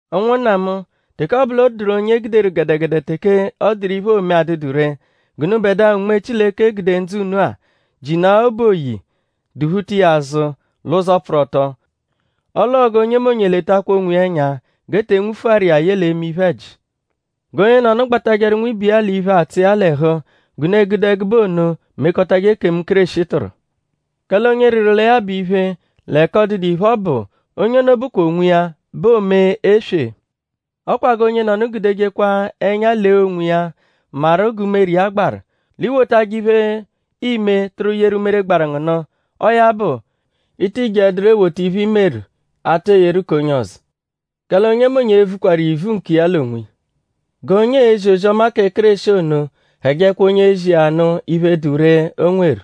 Ụnwunna mu; teke ọ bụ l'ọ dụru onye e guderu gẹdegede teke ọ dụru iphe, oome adụdu ree; g'unubẹdua, Unme Chileke gude ndzụ unu-a; jinaa obu oyi duphuta iya azụ l'ụzo pfụru ọto. Ọle ọo g'onyemonye letakwa onwiya ẹnya g'e te nwufuaru iya ye l'eme iphe-ẹji. G'onyenọnu gbatajẹru nwibe iya l'iphe, atsụ iya l'ẹhu g'unu e-gude ẹgube ono mekọtaje ekemu, Kéreshi tụru. Kẹle onye rịru lẹ ya bụ iphe l'ẹka ọ dụdu iphe, ọ bụ; onye ono bụkwa onwiya bẹ oome eswe. Ọ kwa g'onyenọnu gudejekwa ẹnya lee onwiya maru g'umere iya gbaru; l'i wotajẹ iphe, iime tụru yeru umere gbaru ngu nụ. Ọo ya bụ; i ti jeẹduro ewota iphe, i meru atụru eyeru k'onye ọzo. Kẹle onyemonye e-vukwaru ivu nkiya l'onwiya. G'onye, eezi ozi-ọma kẹ Kéreshi ono hẹjekwa onye ezi iya ya nụ iphe, dụ ree, o nweru.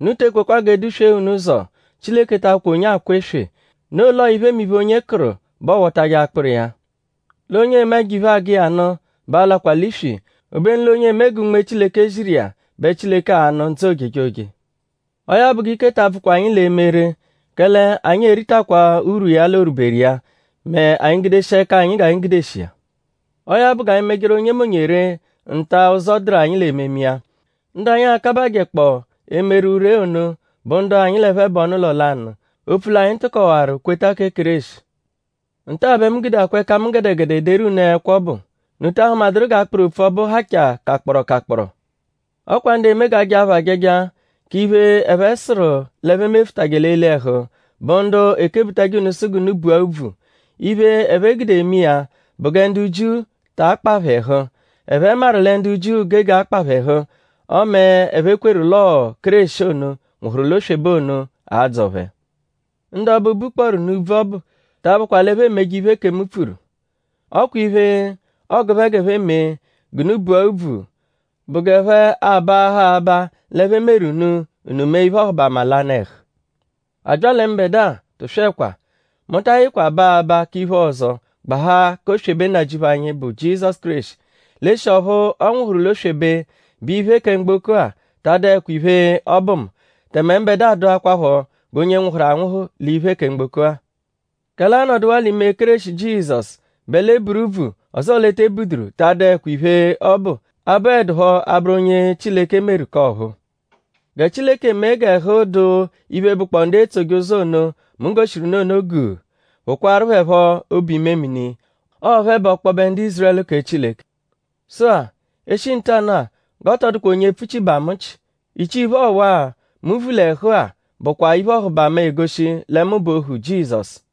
Unu te ekwekwa g'e duswee unu ụzo; Chileke ta abụkwa onye akwa eswe; noo l'ọo iphemiphe, onye kụru bẹ ọowotaje akpụru iya. L'onye eme ẹjo-iphe, agụ iya nụ bẹ a-lakwa l'iswi. Obenu l'onye eme gẹ Unme Chileke ziru iya bẹ Chileke a-nụ ndzụ ojejoje. Ọo ya bụ g'ike ta abvụkwa anyi l'eme ree; kẹle anyi e-ritakwaa urwu iya l'orwuberu iya mẹ anyi -gudeshia ẹka anyi g'anyi gudeshi iya. Ọo ya bụ g'anyi mejeru onyemonye ree nta, ụzo dụru anyi l'ememe iya. Ndu anyi a-kabajẹkpoo emeru ree ono bụ ndu anyi l'ẹphe bụ ọnu-ụlo lanụ; opfu l'anyi tụkowaru kweta kẹ Kéreshi. Nta-a bẹ mu gudeakwa ẹka mu gẹdegede ederu unu ẹkwo ọbu.?Unu ta ahụmaduru g'akpụru opfu ọbu hachaa kakpọro kakpọro? Ọ kwa ndu eme g'a jaa phẹ ajaja k'iphe, ẹphe sụru l'e mefụtaje l'eli ẹhu bụ ndu ekebutajẹ unu sụ g'unu bua úbvù. Iphe, ẹphe gude eme iya bụ gẹ ndu Jiu ta akpa phẹ ẹhu. Ẹphe maru lẹ ndu Jiu gege akpa phẹ ẹhu; ọme ẹphe kweru l'ọo 'ẹpho Kéreshi ono, nwụhuru l'oswebe ono a-dzọ phẹ. Ndu ọbu, bukpọoru nụ úbvù ọbu ta abụkwa l'ẹphe emeje iphe ekemu pfuru. Ọ kwa iphe, ọogu phẹ g'ẹphe mee g'unu bua úbvù bụ g'ẹphe abaaha aba l'ẹphe meru unu; unu mee iphe-ọhubama l'anụ-ẹhu. A bya lẹ mbẹdua; tụswekwa! Mu ta ayịkwa baa aba k'iphe ọzo gbahaa k'oswebe Nnajịuphu anyi, bụ Jizọsu Kéreshi. L'eshi ọphu ọ nwụhuru l'oswebe bẹ iphe kẹ mgboko-a ta adụekwa iphe, ọ bụ mu; tẹme mbẹdua dụakwapho g'onye nwụhuru anwụhu l'iphe kẹ mgboko-a. Kẹle anọduwaa l'ime Kéreshi Jizọsu bẹ l'e buru úbvù; ọzoo l'e te buduru ta adụekwa iphe, ọ bụ, abụedupho abụru onye Chileke meru k'ọ̀phúú. Gẹ Chileke mee g'ẹhu dụ iphe, bụkpoo ndu etsoje ụzo ono, mu goshiru unu ono guu; phụkwaaru phẹ phọ obu-imemini. Ọo phẹ bụ ọkpobe ndu Ízurẹlu kẹ Chileke. Sụ-a; e -shi ntanụ-a g'ọ tọ dụkwa onye epfuchibaa mu nchị. Ichii-iphe ọwa-a, mu vu l'ẹhu-a bụakwaa iphe-ọhubama, egoshi lẹ mu bụ ohu Jizọsu.